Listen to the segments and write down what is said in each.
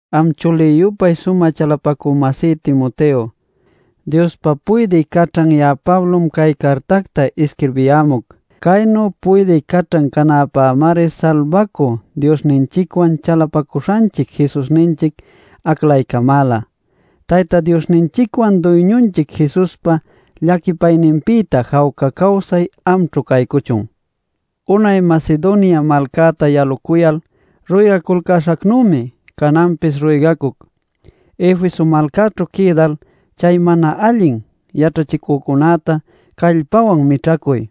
Am chulï-yupay sumä chalapacü-masí Timoteo, Diospa puydï caćhan ya'a Pablom cay cartacta isquirbiyämuc. Caynu puydï caćhan canäpämari Salbacü Diosninchicwan chalapacuśhanchic Jesusninchic aclaycamäla. Tayta Diosninchicwan Duyñunchic Jesuspa llaquipayninpïta jawca cawsay amćhu caycuchun. Unay Macedonia malcäta yalucuyal ruygacuśhacnümi, cananpis ruygacuc: Efeso malcaćhu quïdal chay mana allin yaćhachïcunäta callpawan mićhacuy,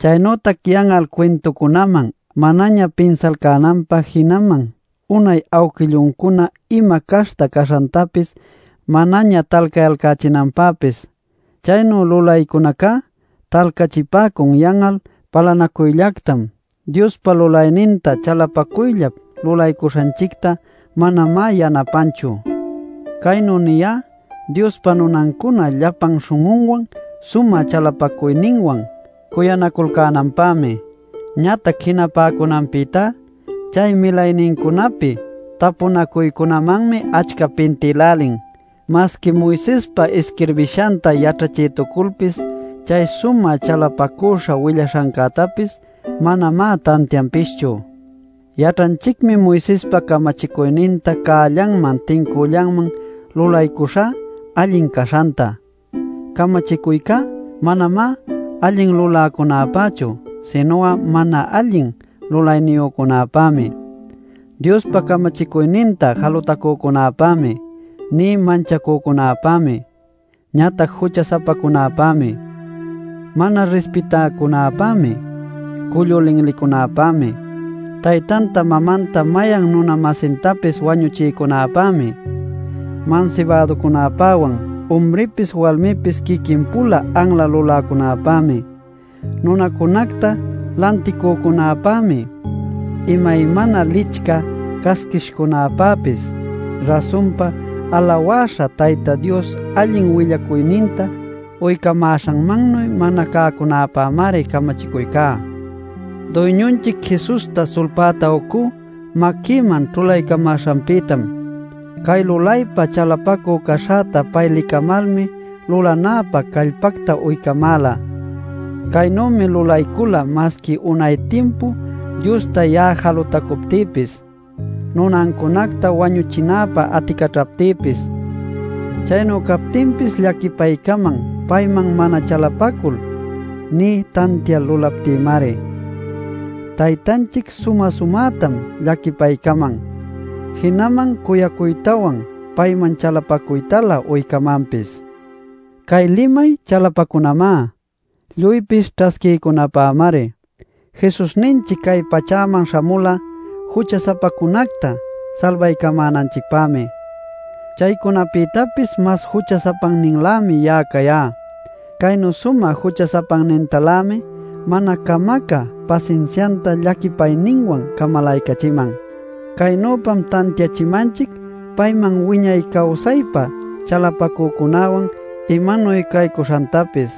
chaynütac yan'al cuintucunaman manaña pinsalcänanpä jinaman unay awquilluncuna ima caśhta caśhantapis manaña talcayalcächinanpäpis. Chaynu lulaycunacá talcachipäcun yan'al palanacuyllactam; Diospa lulayninta chalapacuyllap lulaycuśhanchicta manamá yanapanchu. Caynu niyá: Diospa nunancuna llapan śhun'unwan sumä chalapacuyninwan cuyanaculcänapämi. Ñatac jinapäcunanpïtá chay milaynincunapi tapunacuycunamanmi achca pintïlälin. Masqui Moisespa isquirbishanta yaćhachïtuculpis chay sumä chalapacüśha willaśhancätapis manamá tantianpischu. Yaćhanchicmi Moisespa camachicuyninta cällanman tincüllanman lulaycuśhá allin caśhanta. Camachicuycá manamá allin luläcunäpächu, sinu'a mana allin lulayniyücunäpämi, Diospa camachicuyninta jalutacücunäpämi nï manchacücunäpämi, ñatac jucha-sapacunäpämi, mana rispitäcunäpämi, cullu linlicunäpämi, taytanta mamanta mayan nuna-masintapis wañuchïcunäpämi, mansibäducunapäwan, umripis walmipis quiquin-pula anla luläcunäpämi, nunacunacta lanticücunäpämi, imaymana licchä casquishcunäpäpis. Rasunpa, alawäśha Tayta Dios allin willacuyninta uycamäśhanmannuy mana cäcunäpämari camachicuycá. Duyñunchic Jesusta sulpäta ucú maquïman ćhulaycamäśhanpïtam. Cay lulaypa chalapacü caśhäta pay licamalmi lulanäpä callpacta uycamäla. Caynümi lulaycula masqui unay timpu Diosta ya'a jalutacuptïpis, nunancunacta wañuchinäpa aticaćhaptïpis. Chaynu captinpis llaquipaycaman payman mana chalapacul, nï tantial lulaptïmari. Taytanchic sumä-sumätam llaquipaycaman, jinaman cuyacuytawan payman chalapacuytalä uycamanpis. Cay limay chalapacunamá, lluypis ćhasquiycunapämari: Jesusninchic cay pachäman śhamula jucha-sapacunacta salbaycamänanchicpämi. Chaycunapïtapis mas jucha-sapanninlämi ya'a cayá. Caynu sumä jucha-sapannintalämi mana camacä pasinsianta llaquipayninwan camalaycachiman. Caynüpam tantiachimanchic payman wiñay cawsaypa chalapacücunäwan imanuy caycuśhantapis.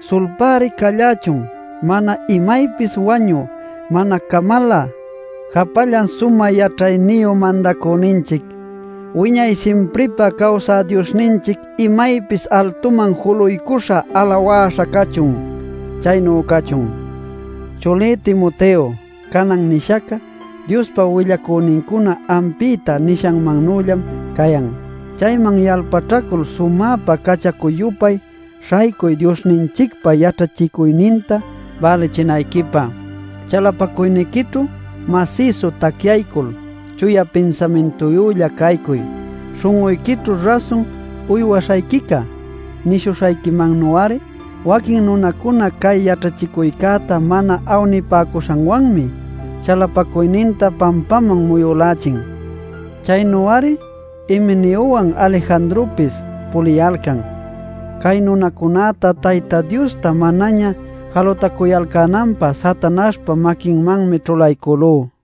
¡Sulpäri callächun mana imaypis wañü, mana camalä, japallan sumä yaćhayniyu Mandacüninchic! ¡Wiñay simpripä cawsä Diosninchic imaypis altuman juluycuśha alawaśha cachun! ¡Chaynu cachun! Chulí Timoteo, canan nishac'a Diospa willacünincuna ampïta nishanmannüllam cayan. Chayman yalpaćhacul sumäpa cachacu-yupay śhaycuy Diosninchicpa yaćhachicuyninta bälichinayquipä. Chalapacuyniquićhu masïsu tacyaycul chuya pinsamintuyülla caycuy śhun'uyquićhu rasun uywaśhayquica nishuśhayquimannu'ari. Waquin nunacuna cay yaćhachicuycäta mana awnipäcuśhanwanmi chalapacuyninta pampaman muyülächin. Chaynu-ari Himeneowan Alejandropis puliyalcan. Cay nunacunäta Tayta Diosta manaña jalutacuyalcänanpä Satanaśhpa maquinmanmi ćhulaycülú.